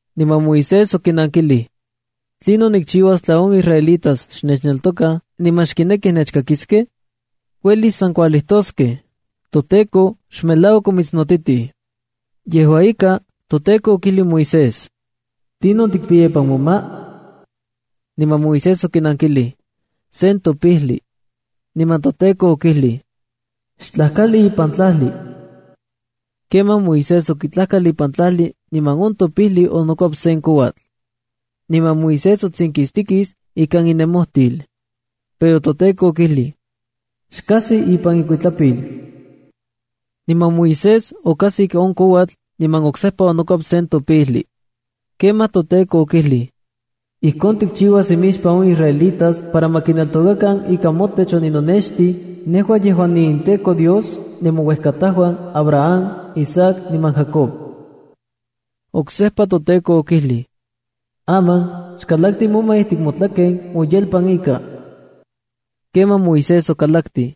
Niman Moisés okinankilij: —¿Tlinon nikchiuas tla on israelitas xnechneltokaj niman xkinekij nechkakiskej? Uelis san kualijtoskej: “ToTEKO xmelauak omitsnotitij.” Yejua ika, toTEKO okijlij Moisés: —¿Tlinon tikpiya ipan moma? Niman Moisés okinankilij: —Sen topijli. Niman toTEKO okijlij: —Xtlajkali ipan tlajli. Kemaj Moisés okitlajkal ipan tlajli niman on topijli onokuep sen kouatl. Niman Moisés otsinkistikis ikan inemojtil. Pero toTEKO okijlij: —Xkajsi ipan ikuitlapil. Niman Moisés okajsik on kouatl, niman oksejpa onokuep topijli. Kemaj toTEKO okijlij: —Ijkon tikchiuas imixpan on israelitas para ma kineltokakan ika motech oninonextij, nejua yejuan niinTEKO Dios nemouejkatajuan, Abraham, Isaac niman Jacob. Oksejpa toTEKO okijlij: —Aman, xkalakti moma ijtik motlaken moyelpan ika. Kemaj Moisés okalaktij.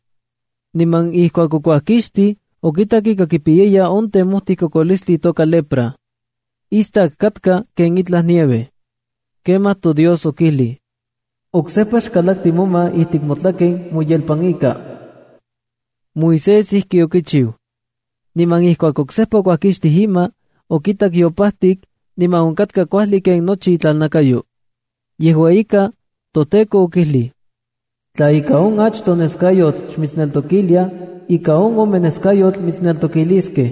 Niman ijkuak okuajkixtij, okitak ika kipiyaya on temojti kokolistli itoka lepra. Istak katka ken itlaj nieve. Kemaj toDios okijlij: —Oksejpa xkalakti moma ijtik motlaken moyelpan ika. Moisés ijki okichiu. Niman ijkuak oksejpa okuajkixtij ima, okitak yopajtik, niman onkatka kuajli ken nochi itlalnakayo. Yejua ika, toTEKO okijlij: —Tla ika on achtoj neskayotl xmitsneltokiliaj, ika on ome neskayotl mitsneltokiliskej.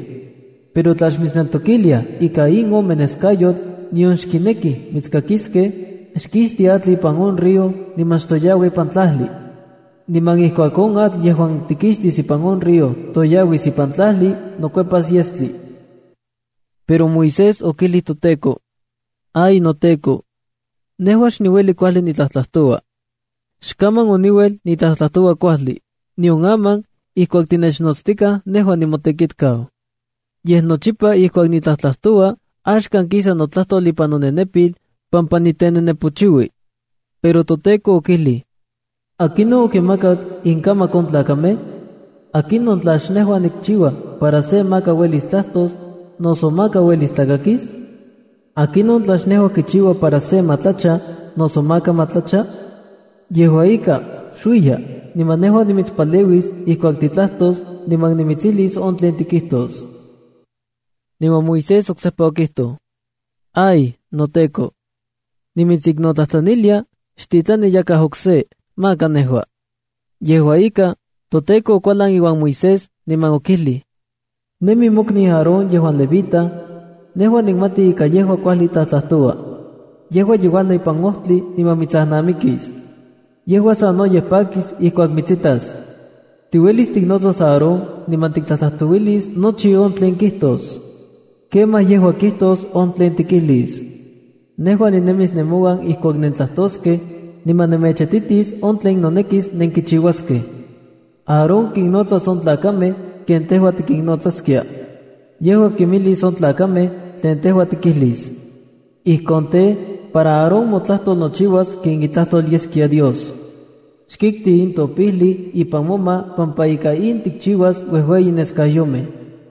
Pero tla xmitsneltokiliaj ika in ome neskayotl, nion xkinekij mitskakiskej, xkixti atl ipan on río, niman xtoyaua ipan tlajli. Niman ijkuak on atl yejuan tikixtis ipan on río toyauis ipan tlajli, nokuepas yestli. Pero Moisés okijlij toTEKO: —¡Ay, noTEKO! Nejua xniueli kuajli nitlajtlajtoua. Xkaman oniuel nitlajtlajtoua kuajli, nion aman ijkuak tinechnotstikaj nejua nimotekitkau. Yej nochipa ijkuak nitlajtoua, axkan kisa notlajtol ipan nonenepil, pampa nitenenepochiui. Pero toTEKO okijlij: —¿Akinon okinmakak inkamak on tlakamej? ¿Akinon tla xnejua nikchiua para se maka uelis tlajtos, noso maka uelis tlakakis? ¿Akinon tla xnejua kichiua para se ma tlacha, noso maka ma tlacha? Yejua ika, xuiya, niman nejua nimitspaleuis ijkuak titlajtos, niman nimitsijlis on tlen tikijtos. Niman Moisés oksejpa okijtoj: —¡Ay, noTEKO! Nimitsiknotlajtlanilia, xtitlani yakaj okse, maka nejua. Yejua ika, toTEKO okualan iuan Moisés, niman okijlij: —¡Nemi mokniu Aarón yejuan levita! Nejua nikmati ika yejua kuajli tlajtlajtoua. Yejua ye uajlau ipan ojtli niman mitsajnamikis. Yejua sanoyej pakis ijkuak mitsitas. Tiuelis tiknotsas Aarón niman tiktlajtlajtouilis nochi on tlen kijtos. Kemaj yejua kijtos on tlen tikijlis. Nejua ninemis nemouan ijkuak nentlajtoskej, niman nemechititis on tlen nonekis nenkichiuaskej. Aarón kinnotsas on tlakamej ken tejua tikinnotsaskia. Yejua kimijlis on tlakamej tlen tejua tikijlis. Ijkon tej, para Aarón motlajtol nochiuas ken itlajtol yeskia Dios. Xkikti in topijli ipan moma pampa ika in tikchiuas uejueyi neskayomej.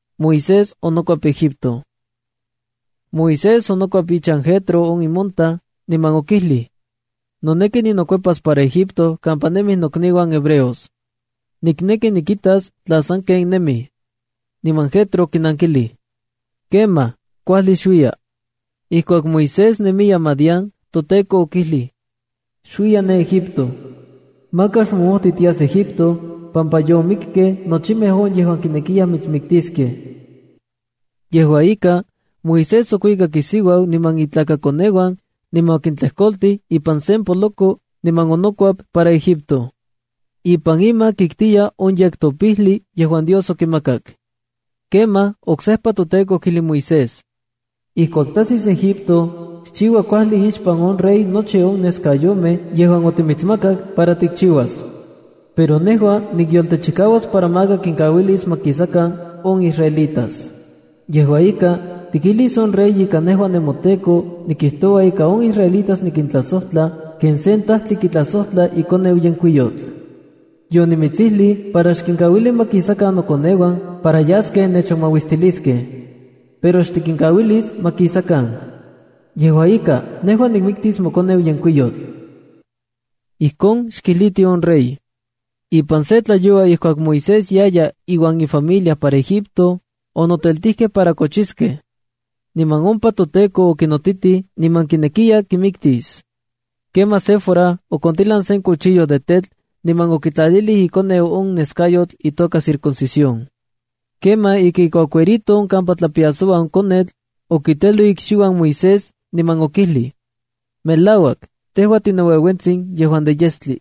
Moisés onokuep ichan Jetro on imontaj, niman okijlij: —Noneki ninokuepas para Egipto kampa nemij nokniuan hebreos. Nikneki nikitas tla sanken nemij. Niman Jetro okinankilij: —Kemaj, kuajli xuiya. Ijkuak Moisés nemiya Madián, toTEKO okijlij: —Xuiya ne Egipto. Maka xmomojti tias Egipto, pampa yomikej nochimej on yejuan kinekiyaj mitsmiktiskej. Yejua ika, Moisés okuikak isiuau niman itlakakoneuan, niman okintlejkoltij ipan sen poloko, niman onokuep para Egipto. Ipan ima kiktiya on yektopijlia yejuan Dios okimakak. Kemaj oksejpa toTEKO okijlij Moisés: —Ijkuak tajsis Egipto, xchiua kuajli ixpan on rey nochi on neskayomej yejuan otimitsmakak para tikchiuas. Pero nejua nikyoltechikauas para maka kinkauilis ma kisakan on israelitas. Yejua ika, tikijlis on rey ika nejua nemoTEKO nikijtoua ika on israelitas nikintlajsojtla ken sen tajtli kitlajsojtla ikoneu yenkuiyotl. Yonimitsijlij para xkinkauili ma kisakan nokoneuan para yaskej nechonmauistiliskej. Pero xtikinkauilis ma kisakan. Yejua ika, nejua nikmiktis mokoneu yenkuiyotl. Ijkon xkijliti on rey. Ipan se tlayoua ijkuak Moisés yaya iuan ifamilia para Egipto, onoteltijkej para kochiskej. Niman ompa toTEKO okinotitij niman kinekiya kimiktis. Kemaj Séfora okontilan sen cuchillo de tetl niman okitlalilij ikoneu on neskayotl itoka circuncisión. Kemaj ika ikuacuerito on kampa tlapiasoua on konetl, okiteloj ikxiuan Moisés, niman okijlij: “Melauak, tejua tinoueuentsin yejuan de yestli.”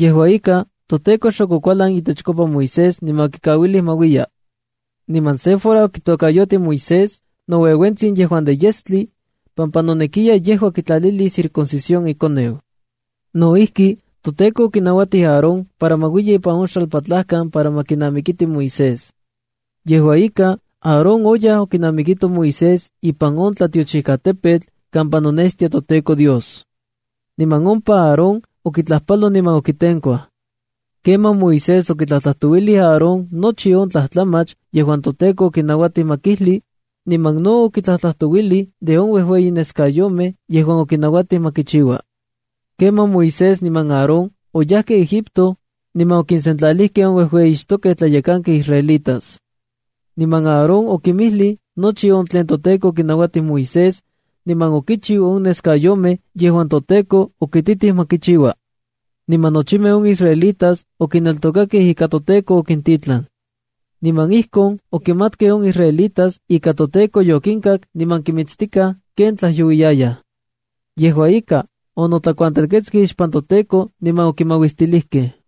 Yejua ika, toTEKO xok okualan itechkopa Moisés niman okikauilij ma uiya. Niman Séfora okitokayotij Moisés “Noueuentsin Yejuan de Yestli” pampa nonekiya yejua kitlalilis circuncisión ikoneu. No ijki, toTEKO okinauatij Aarón para ma uiya ipan on xalpatlajkan para ma kinamikiti Moisés. Yejua ika, Aarón oyaj okinamikito Moisés ipan on tlatiochijkatepetl kampa nonextia toTEKO Dios. Niman ompa Aarón okitlajpaloj niman okitenkuaj. Kemaj Moisés okitlajtlajtouilij Aarón nochi on tlajtlamach yejuan toTEKO okinauatij ma kijli, niman no okitlajtlajtouilij de on uejueyi neskayomej yejuan okinauatij ma kichiua. Kemaj Moisés niman Aarón oyajkej Egipto, niman okinsentlalijkej on uejueyixtokej tlayekankej israelitas. Niman Aarón okinmijlij nochi on tlen toTEKO okinauatij Moisés, niman okichiub on neskayomej yejuan toTEKO okititij ma kichiua. Niman nochimej on israelitas okineltokakej ika toTEKO okintitlan. Niman ijkon okimatkej on israelitas ika toTEKO yokinkak niman kinmitstikaj ken tlajyouiyayaj. Yejua ika, onotlakuantelketskej ixpan toTEKO niman okimauistilijkej.